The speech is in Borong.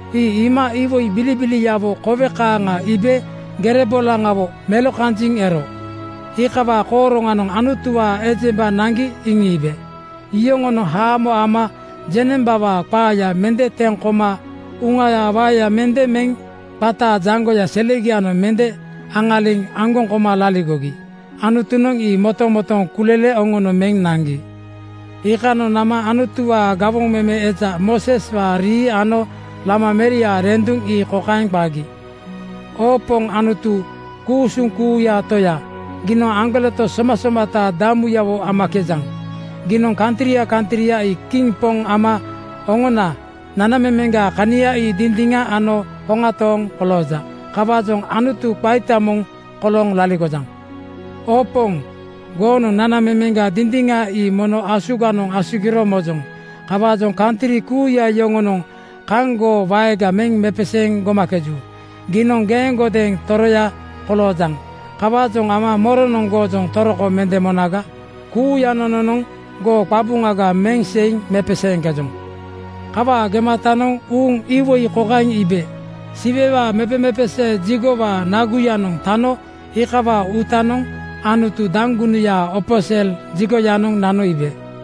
Ii iima iwoi bilibiliawo kowe kaaŋa iibe gere bolaŋawo melokanjiŋ ero. Iikawaa kooroŋanoŋ Anutuwaa ejemba naŋgi iŋiibe. Yoŋonoŋ haamo ama jeŋnembawaa qaaya mende teŋ koma uŋayaa waeya mende meŋ qataa jaŋgoya selegianoŋ mende aŋaliŋ aŋgoŋ koma laligogi. Anutunoŋ ii motomotooŋ kulele oŋono meŋ naŋgi. Iikanoŋ nama Anutuwaa gawoŋ meme eja Mooseswaa rii ano Lama meriaa renduŋ ii kokaeŋ qagi, “Oo Poŋ Anutu ku-usuŋ kuuyaa Toya, giinoŋ aŋgoleto somasomata damuyawo amakejaŋ. Giinoŋ kantria kantria ii kiŋ poŋ ama oŋona nanamemeŋgaa kania ii dindiŋa ano hoŋa tooŋ kolooja. Kawaajoŋ Anutu qaita moŋ kolooŋ laligojaŋ. Oo Poŋ, goonoŋ nanamemeŋga dindiŋa ii mono asuganoŋ asugiro mojoŋ. Kawaajoŋ kantri kuuya yoŋonoŋ kaŋ goo waega meŋ mepeseeŋ gomakeju. Giinoŋ geeŋgodeeŋ toroya koloojaŋ. Kawaajoŋ ama moronoŋ goojoŋ toroko mende monaga? Kuuya nononoŋ goo qabuŋaga meŋ seiŋ mepeseeŋkejoŋ.” Kawaa gematanoŋ uuŋ iwoi kokaeŋ iibe: Siwewaa mepemepesee jigowaa (tempel) naguyanoŋ tano iikawaa uutanoŋ Anutu daŋgunuyaa opo sel jigoyanoŋ nano iibe.